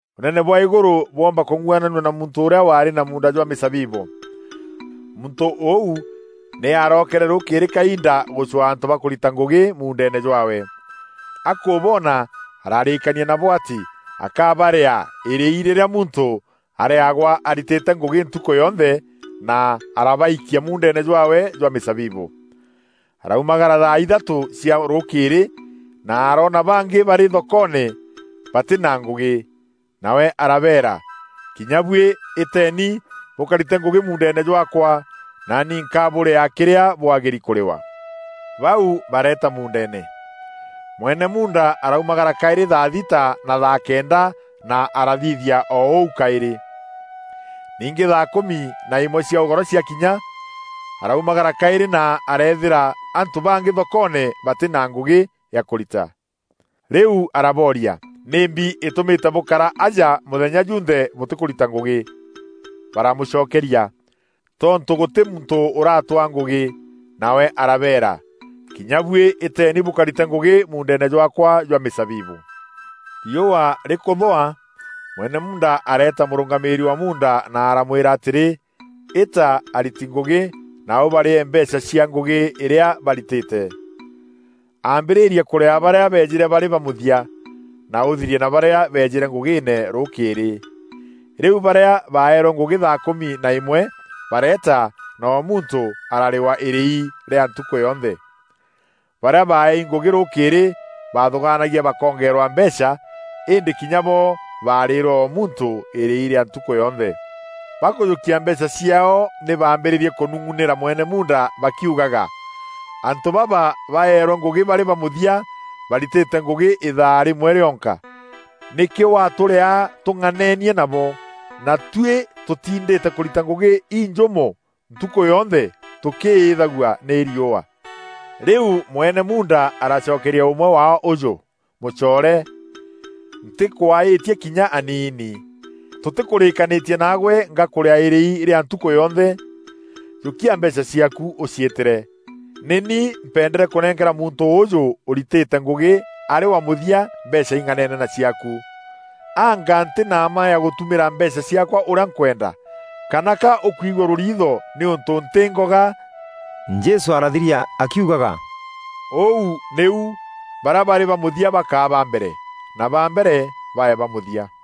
“Ûnene bwa îgûrû bwoomba kûng'uananua na muntû ûrîa waarî na muunda jwa mîzabibû. Muntû ûu nî arookere rûûkîrî kainda gûcwaa antû ba kûrita ngûgî muundeene jwaawe. Akûboona ararîîkania nabo atî akabarîaa îrîi rîrîa muntû arîagwa aritîte ngûgî ntukû yonthe, na arabaikia muundeene jwaawe jwa mîzabibû. Araumagara thaa ithatû cia rûûkîrî, na aroona bangî barî thokoone, batî na ngûgî. Nawe arabeera, ‘Kinya buî îteeni bûkarîte ngûgî muundeene jwaakwa, naani nkabûrîaa kîrîa bwagîri kûrîwa!’ Bau bareeta muundeene. Mwene muunda araumagara kaîrî thaa thîta na thaa kenda na arathithia o ûu kaîrî. Ningî thaa kûmi na îmwe cia ûgoro ciakinya, araumagara kaîrî na areethîra antû bangî thokoone batî na ngûgî ya kûrita. Rîu arabooria, ‘Nîmbi îtûmîte bûkara aja mûthenya jûnthe bûtîkûrita ngûgî?’ Baramûcokeria, ‘Tontû gûtî muntû ûratwaa ngûgî.’ Nawe arabeera, ‘Kinya buî îteeni bûkarîte ngûgî muundeene jwaakwa jwa mîzabibû.’ “Riûa rîkûthûa, mwene muunda areeta mûrûngamîîri wa muunda na aramwîra atîrî, ‘Îta ariti ngûgî na ûbarîee mbeecha cia ngûgî îrîa barîtîte. Ambîrîria kûrîaa barîa beejîre barî ba mûthia, na ûthirie na barîa beejîre ngûgîîne rûûkîrî.’ Rîu barîa baerwe ngûgî thaa kûmi na îmwe bareeta na o muntû ararîwa îrîi rîa ntukû yonthe. Barîa baaeei ngûgî rûûkîrî, baathûgaanagia bakongeererwa mbeecha, îndî kinya bo barîîrwe o muntû îrîi rîa ntukû yonthe. Bakûjûkia mbeecha ciaao, nî bambîîrîrie kûnûng'unîra mwene muunda bakiugaga, ‘Antû baba baerwe ngûgî barî ba mûthia baritîre ngûgî îthaa rîmwe rîonka. Nîkî watûrîaa tûng'aneenie nabo, na tuî tûtindîte kûrita ngûgî înjûmû ntukû yonthe tûkîîthagua nî riûa?’ Rîu mwene muunda aracokeria ûmwe waao ûjû: ‘Mûcoore, ntîkwaîtie kinya aniini! Tûtîkûrîîkanîtie naagwe ngakûrîaa îrîi rîa ntukû yonthe? Jûkia mbeecha ciaaku, ûciîtîre. Nî ni mpendere kûnenkera muntû ûûjû ûritîre ngûgî arî wa mûthia mbeecha ing'aneene na ciaaku. Anga ntî na mma ya gûtumîra mbeecha ciaakwa ûrîa nkwenda? Kana ka ûkwigua rûriitho nîûntû ntî ngoga?’” Jesû arathiria akiugaga, “Ûu nîu barîa barî ba mûthia bakaa ba mbere, na ba mbere, bae ba mûthia.”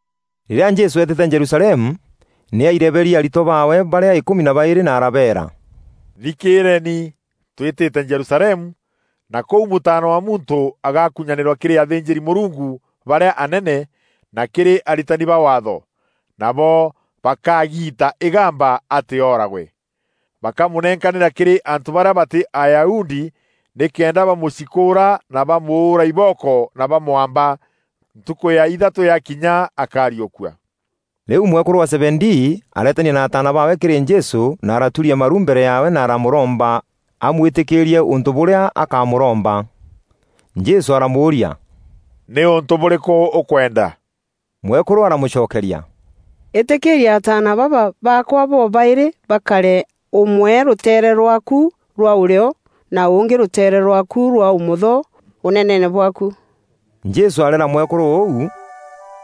Rîrîa Jesû eetîte Jerusalemu, nî aireberie aritwa baawe barîa îkûmi na baîrî na arabeera, “Thikîîreeni! Twîtîte Jerusalemu, na kûu Mûtaana wa Muntû agakunyanîrwa kîrî athînjîri-Mûrungu barîa anene na kîrî aritani ba Waatho. Nabo bakagiita îgamba atî ooragwe. Bakamûnenkanîra kîrî antû barîa batî Ayahudi nîkenda bamûcikûûra na bamûûra ibooko na bamwamba. Ntukû ya ithatû yakinya akariûkua.” Rîu mwekûrû wa Zebedii areetania na ataana baawe kîrî Jesû na araturia maru mbere yaawe na aramûromba amwîtîkîîrie ûntû bûrîa akamûromba. Jesû aramûûria, “Nî ûntû bûrîkû ûkwenda?” Mwekûrû aramûcokeria, “Îtîkîîria ataana baba baakwa bobaîrî bakare ûmwe rûteere rwaaku rwa ûrîo, na ûngî rûteere rwaaku rwa ûmotho Ûneneene bwaaku.” Jesû areera mwekûrû ûu,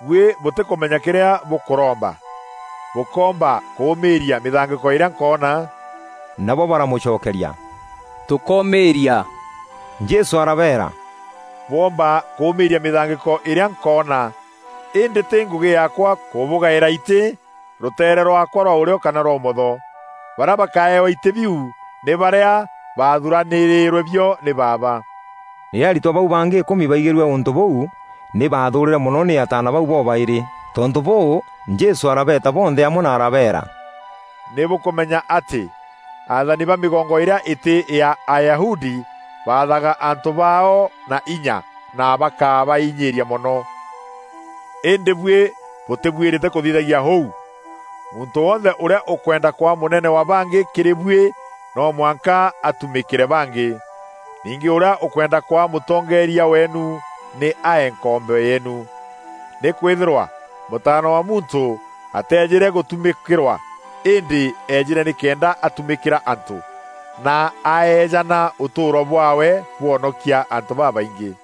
“Buî bûtîkûmenya kîrîa bûkûromba. Bûkoomba kûûmîîria mîthangîko îrîa nkoona?” Nabo baramûcokeria, “Tûkomîîria.” Jesû arabeera, “Bwoomba kûûmîîria mîthangîko îrîa nkoona, îndî tî ngûgî yaakwa kûbugaîra itî rûteere rwaakwa rwa ûrîo kana rwa ûmotho. Barîa bakaewa itî biu nî barîa bathûûranîrîrwe bio nî Baaba.” Rîrîa aritwa bau bangî îkûmi baigîrue ûntû bûu nî baathûûrîre mono nî ataana bau bobaîrî. Tontû bûû, Jesû arabeeta bonthe amwe na arabeera, “Nî bûkûmenya atî athani ba mîgongo îrîa îtî ya Ayahudi bathaga antû baao na inya, na bakabainyîîria mono. Îndî buî bûtîbuîrîte kûthithagia ûu. Muntû wonthe ûrîa ûkwenda kwaa mûnene wa bangî kîrî buî, no mwanka atumîkîre bangî. Ningî ûrîa ûkwenda kwaa mûtongeeria weenu nî ae nkombo yeenu. Nîkwîthîrwa Mûtaana wa Muntû aateejîre gûtumîkîrwa, îndî eejîre nîkenda atumîkîra antû, na aeejana ûtûûro bwaawe bwonokia antû babaingî.”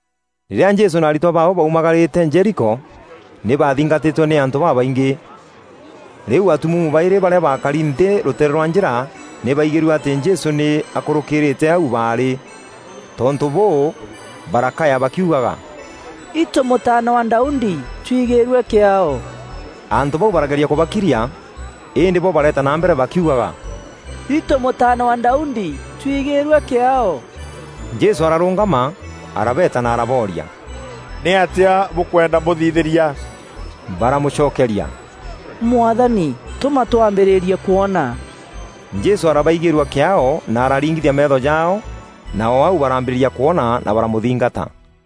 Rîrîa Jesû na aritwa baawe baumagarîte Jeriko, nî baathingatîtwe nî antû babaingî. Rîu atumuumu baîrî barîa baakari nthî rûteere rwa njîra nî baigîrue atî Jesû nî akûrûkîrîîte au baarî. Tontû bûû barakaya bakiugaga, “Itû Mûtaana wa Daudi, twigîrue kîaao!” Antû bau barageria kûbakiria, îndî bo bareeta na mbere bakiugaga, “Itû Mûtaana wa Daudi, twigîîrue kîaao!” Jesû ararûngama, arabeeta na arabooria, “Nîatîa bûkwenda mbûthithîria?” Baramûcokeria, “Mwathani, tûma twambîrîrie kwona.” Jesû arabaigîîrua kîaao na araringithia meetho jaao, na o au barambîrîria kwona na baramûthingata.